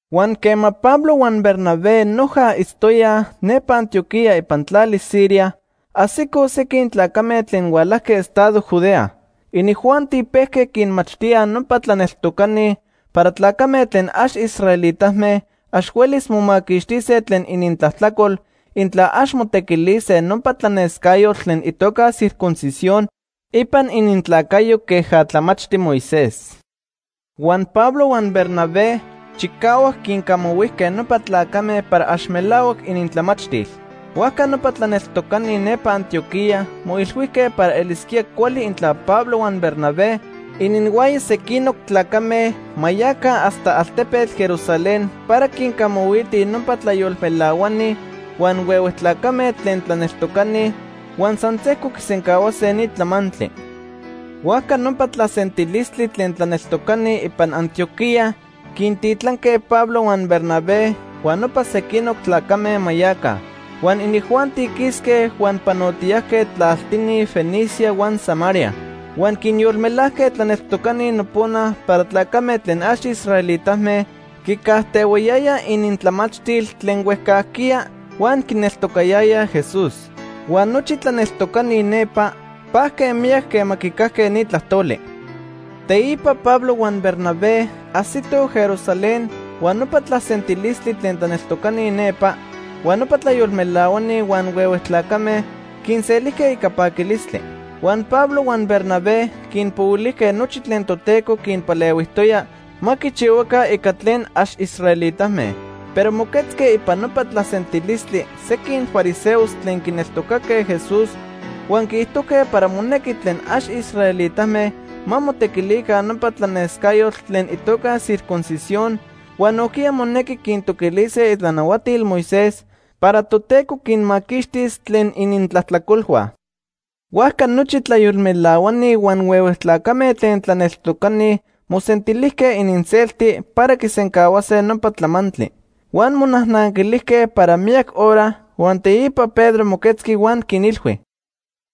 Huan quema Pablo huan Bernabé noja itztoyaj nepa Antioquía ipan tlali Siria, ajsicoj sequin tlacame tlen hualajque estado Judea. Inijuanti pejque quinmachtíaj nopa tlaneltocani para tlacame tlen ax israelitame ax huelis momaquixtise tlen inintlajtlacol intla ax motequilise nopa tlanescayotl tlen itoca circuncisión ipan inintlacayo queja tlamachti Moisés. Huan Pablo huan Bernabé chicahuac quincamahuijque nopa tlacame para ax melahuac inintlamachtil. Huajca nopa tlaneltocani nepa Antioquía moilhuijque para elisquía cuali intla Pablo huan Bernabé ininhuaya sequinoc tlacame ma yaca hasta altepetl Jerusalén para quincamahuitij nopa tlayolmelahuani huan huehue tlacame tlen tlaneltocani, huan san sejco quisencahuase ni tlamantli. Huajca nopa tlasentilistli tlen tlaneltocani ipan Antioquía quintitlanque Pablo huan Bernabé huan nopa sequinoc tlacame ma yaca. Huan inijuanti quisque huan panotiyajque tlaltini Fenicia huan Samaria. Huan quinyolmelajque tlaneltocani nopona para tlacame tlen ax israelitame quicajtehuayayaj inintlamachtil tlen huejcajquiya huan quineltocayayaj Jesús. Huan nochi tlaneltocani nepa pajque miyac quema quicajque ni tlajtoli. Teipa Pablo huan Bernabé ajsitoj Jerusalén huan nopa tlasentilistli tlen tlaneltocani nepa, huan nopa tlayolmelahuani huan huehue tlacame quinselijque ica paquilistli. Huan Pablo huan Bernabé quinpohuilijque nochi tlen Toteco quinpalehuijtoya ma quichihuaca ica tlen ax israelitame. Pero moquetzque ipan nopa tlasentilistli sequin fariseos tlen quineltocaque Jesús huan quiijtojque para monequi tlen ax israelitame ma motequilica nopa tlanescayotl tlen itoca circuncisión huan nojquiya monequi quintoquilise itlanahuatil Moisés para Toteco quinmaquixtis tlen inintlajtlacolhua. Huajca nochi tlayolmelahuani huan huehue tlacame tlen tlaneltocani mosentilijque ininselti para quisencahuase nopa tlamantli. Huan monajnanquilijque para miyac hora, huan teipa Pedro moquetzqui huan quinilhui: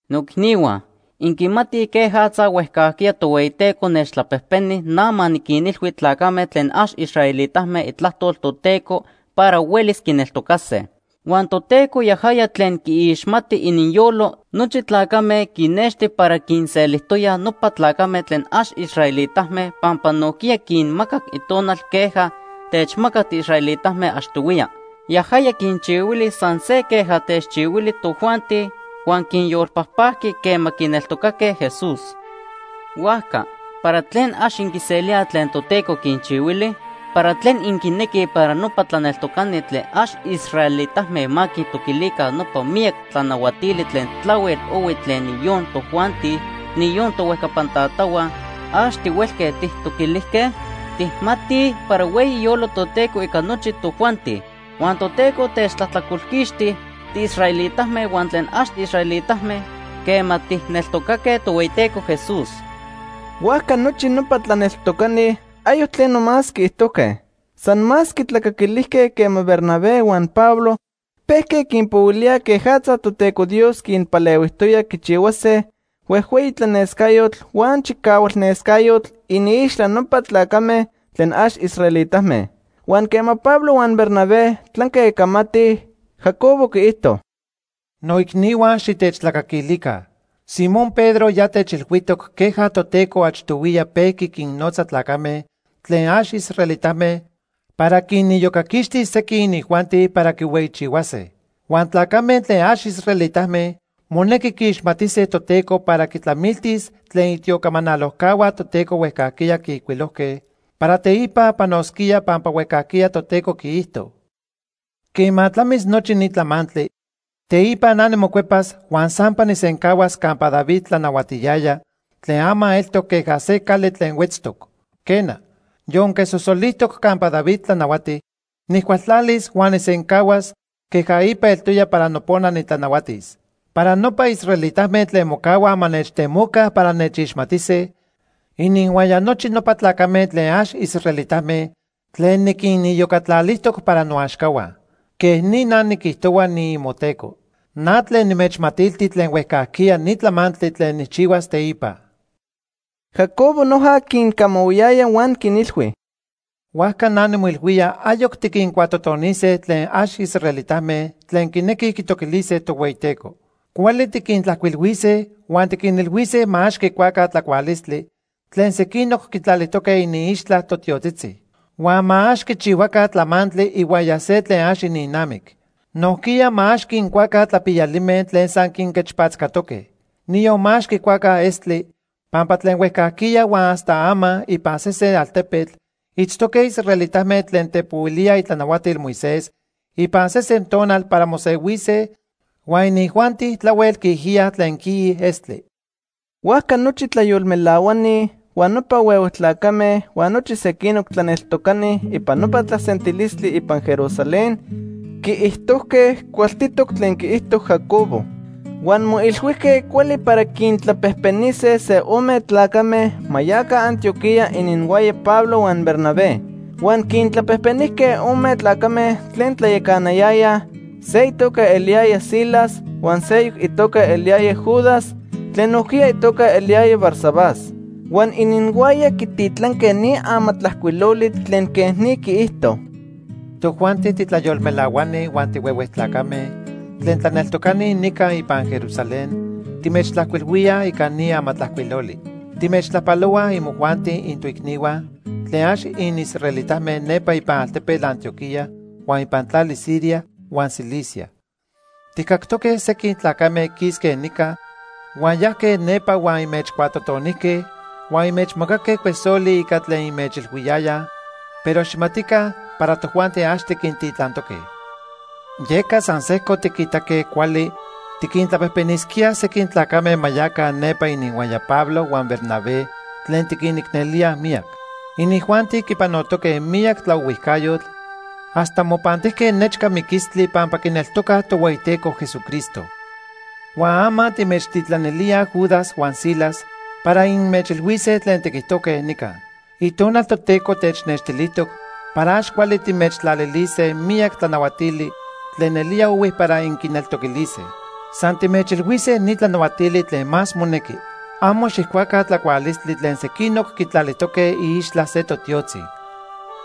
―Noicnihua, inquimatij quejatza huejcajquiya Tohueyiteco nechtlapejpeni na ma niquinilhui tlacame tlen ax israelitame itlajtol Toteco para huelis quineltocase. Huan Toteco yajaya tlen quiixmati ininyolo nochi tlacame quinexti para quinselijtoya nopa tlacame tlen ax israelitame pampa nojquiya quinmacac Itonal queja techmacac tiisraelitame achtohuiya. Yajaya quinchihuili san se queja techchihuili tojuanti, huan quinyolpajpajqui quema quineltocaque Jesús. Huajca ¿para tlen ax inquiselíaj tlen Toteco quinchihuili? ¿Para tlen inquinequij para nopa tlaneltocani tlen ax israelitame ma quintoquilica nopa miyac tlanahuatili tlen tlahuel ohui tlen niyon tojuanti, niyon tohuejcapan tatahua, ax tihuelque tijtoquilijque? Tijmatij para hueyi iyolo Toteco ica nochi tojuanti. Huan Toteco techtlajtlacolquixti tiisraelitame huan tlen ax israelitame quema tijneltocaque Tohueyiteco Jesús. Huajca nochi nopa tlaneltocani ayoc tleno más quiijtojque. San más quitlacaquilijque quema Bernabé huan Pablo pejque quinpohuilíaj quejatza Toteco Dios quinpalehuijtoya quichihuase huejhueyi tlanescayotl huan chicahualnescayotl iniixtla nopa tlacame tlen ax israelitame. Huan quema Pablo huan Bernabé tlanque camatij, Jacobo quiijto: ―Noicnihua, xitechtlacaquilica. Simón Pedro ya techilhuijtoc queja Toteco achtohuiya pejqui quinnotza tlacame tlen ax israelitame para quiniyocaquixtis sequin inijuanti para quihueyichihuase. Huan tlacame tlen ax israelitame monequi quiixmatise Toteco para quitlamiltis tlen itiocamanalojcahua Toteco huejcajquiya quiijcuilojque para teipa panosquía Pampa huejcajquiya Toteco quiijto: ‘Quema tlamis nochi ni tlamantli, teipa na nimocuepas huan sampa nijsencahuas campa David tlanahuatiyaya tlen ama eltoc queja se cali tlen huetztoc. Quena, yonque sosolijtoc campa David tlanahuati, nijcualtlalis huan nijsencahuas queja ipa eltoya para nopona nitlanahuatis. Para nopa israelitame tlen mocahuaj ma nechtemoca para nechixmatise, ininhuaya nochi nopa tlacame tlen ax israelitame tlen niquiniyocatlalijtoc para noaxcahua. Quej ni na niquijtohua, niimoTeco. Na tlen nimechmatilti tlen huejcajquiya ni tlamantli tlen nijchihuas teipa.’ Jacobo noja quincamahui huan quinilhui: ―Huajca na nimoilhuía ayoc tiquincuatotonise tlen ax israelitame tlen quinequij quitoquilise Tohueyiteco. Cuali tiquintlajcuilhuise huan tiquinilhuise ma ax quicuaca tlacualistli tlen sequinoc quitlalijtoque iniixtla totiotzitzi. Huan ma ax quichihuaca tlamantli ihuaya se tlen ax ininnamic. Nojquiya ma ax quincuaca tlapiyalime tlen san quinquechpatzcatoque. Niyon ma ax quicuaca estli, pampa tlen huejcajquiya huan hasta ama ipan sesen altepetl itztoque israelitame tlen tepohuilíaj itlanahuatil Moisés ipan sesen tonal para mosehuise huan inijuanti tlahuel quiijiyaj tlen quiij estli. Huajca nochi tlayolmelahuani, huan nopa huehue tlacame huan nochi sequinoc tlaneltocani ipan nopa tlasentilistli ipan Jerusalén quiijtojque cualtitoc tlen quiijto Jacobo. Huan moilhuijque cuali para quintlapejpenise se ome tlacame ma yaca Antioquía ininhuaya Pablo huan Bernabé. Huan quintlapejpenijque ome tlacame tlen tlayacanayayaj, se itoca eliyaya Silas huan seyoc itoca eliyaya Judas tlen nojquiya itoca eliyaya Barsabás. Huan ininhuaya quititlanque ni amatlajcuiloli tlen quej ni quiijto: Tojuanti titlayolmelahuani huan tihuehue tlacame tlen tlaneltocani nica ipan Jerusalén timechtlajcuilhuíaj ica ni amatlajcuiloli. Timechtlajpalohuaj imojuanti intoicnihua tlen ax inisraelitame nepa ipan altepetl Antioquía huan ipan tlali Siria huan Cilicia. Tijcactoque sequin tlacame quisque nica huan yajque nepa huan inmechcuatotonijque huan inmechmacaque cuesoli ica tlen inmechilhuiyayaj, pero xijmatica para tojuanti ax tiquintitlantoque. Yeca san sejco tiquitaque cuali tiquintlapejpenisquíaj sequin tlacame ma yaca nepa ininhuaya Pablo huan Bernabé tlen tiquinicnelíaj miyac. Inijuanti quipanotoque miyac tlaohuijcayotl hasta mopantijque nechca miquilistlii pampa quineltocaj Tohueyiteco Jesucristo. Huan ama timechtitlanilíaj Judas huan Silas para inmechilhuise tlen tiquijtojque nica. Itonal Toteco technextilijtoc para ax cuali timechtlalilise miyac tlanahuatili tlen nelía ohui para inquineltoquilise. San timechilhuise ni tlanahuatili tlen más monequi: Amo xijcuaca tlacualistli tlen sequinoc quitlalijtoque iixtla se totiotzi.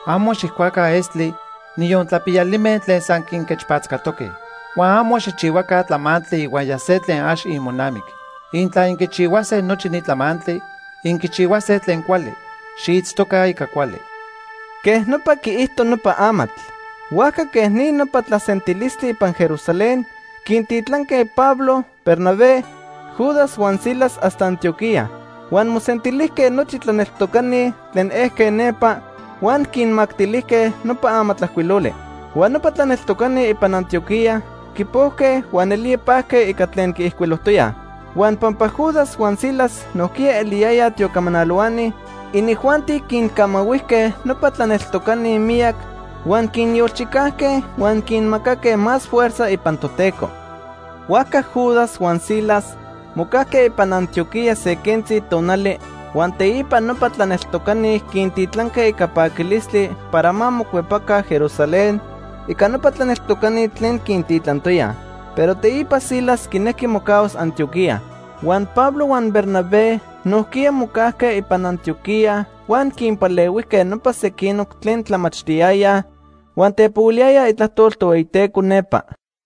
Amo xijcuaca estli, niyon tlapiyalime tlen san quinquechpatzcatoque. Huan amo xijchihuaca tlamantli ihuaya se tlen ax imonamic. Intla inquichihuase nochi ni tlamantli, inquichihuase tlen cuali. Xiitztoca ica cuali. Quej nopa quiijto nopa amatl. Huajca quej ni nopa tlasentilistli ipan Jerusalén quintitlanque Pablo, Bernabé, Judas huan Silas hasta Antioquía. Huan mosentilijque nochi tlaneltocani tlen ejque nepa, huan quinmactilijque nopa amatlajcuiloli. Huan nopa tlaneltocani ipan Antioquía quipojque huan nelía pajque ica tlen quiijcuilojtoyaj. Huan pampa Judas huan Silas nojquiya eliyayaj tiocamanalohuani, inijuanti quincamahuijque nopa tlaneltocani miyac, huan quinyolchicajque huan quinmacaque más fuerza ipan Toteco. Huajca Judas huan Silas mocajque ipan Antioquía se quentzi tonali, huan teipa nopa tlaneltocani quintitlanque ica paquilistli para ma mocuepaca Jerusalén ica nopa tlaneltocani tlen quintitlantoyaj. Pero teipa Silas quinejqui mocahuas Antioquía. Huan Pablo huan Bernabé nojquiya mocajque ipan Antioquía huan quinpalehuijque nopa sequinoc tlen tlamachtiyayaj huan tepohuiliyayaj itlajtol Tohueyiteco nepa.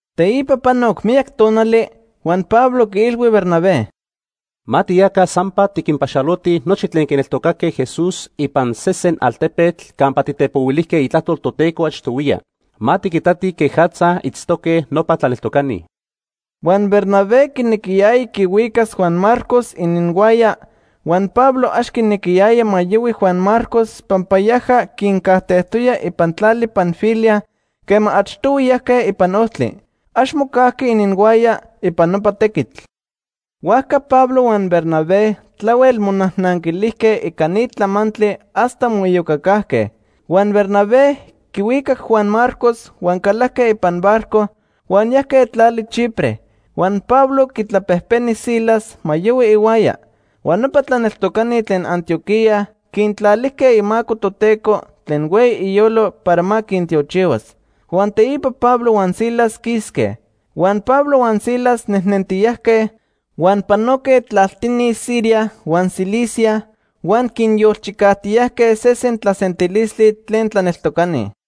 Teipa panoc miyac tonali, huan Pablo quiilhui Bernabé: ―Ma tiyaca sampa, tiquinpaxalotij nochi tlen quineltocaque Jesús ipan sesen altepetl campa titepohuilijque itlajtol Toteco achtohuiya. Ma tiquitatij quejatza itztoque nopa tlaneltocani. Huan Bernabé quinequiyaya quihuicas Juan Marcos ininhuaya, huan Pablo ax quinequiyaya ma yohui Juan Marcos, pampa yaja quincajtejtoya ipan tlali Panfilia quema achtohui yajque ipan ojtli. Ax mocajqui ininhuaya ipan nopa tequitl. Huajca Pablo huan Bernabé tlahuel monajnanquilijque ica ni tlamantli hasta moiyocacajque. Huan Bernabé quihuicac Juan Marcos huan calajque ipan barco huan yajque tlali Chipre. Huan Pablo quitlapejpeni Silas ma yohui ihuaya. Huan nopa tlaneltocani tlen Antioquía quintlalijque imaco Toteco tlen hueyi iyolo para ma quintiochihuas. Huan teipa Pablo huan Silas quisque. Huan Pablo huan Silas nejnentiyajque, huan panoque tlaltini Siria huan Cilicia huan quinyolchicajtiyajque sesen tlasentilistli tlen tlaneltocani.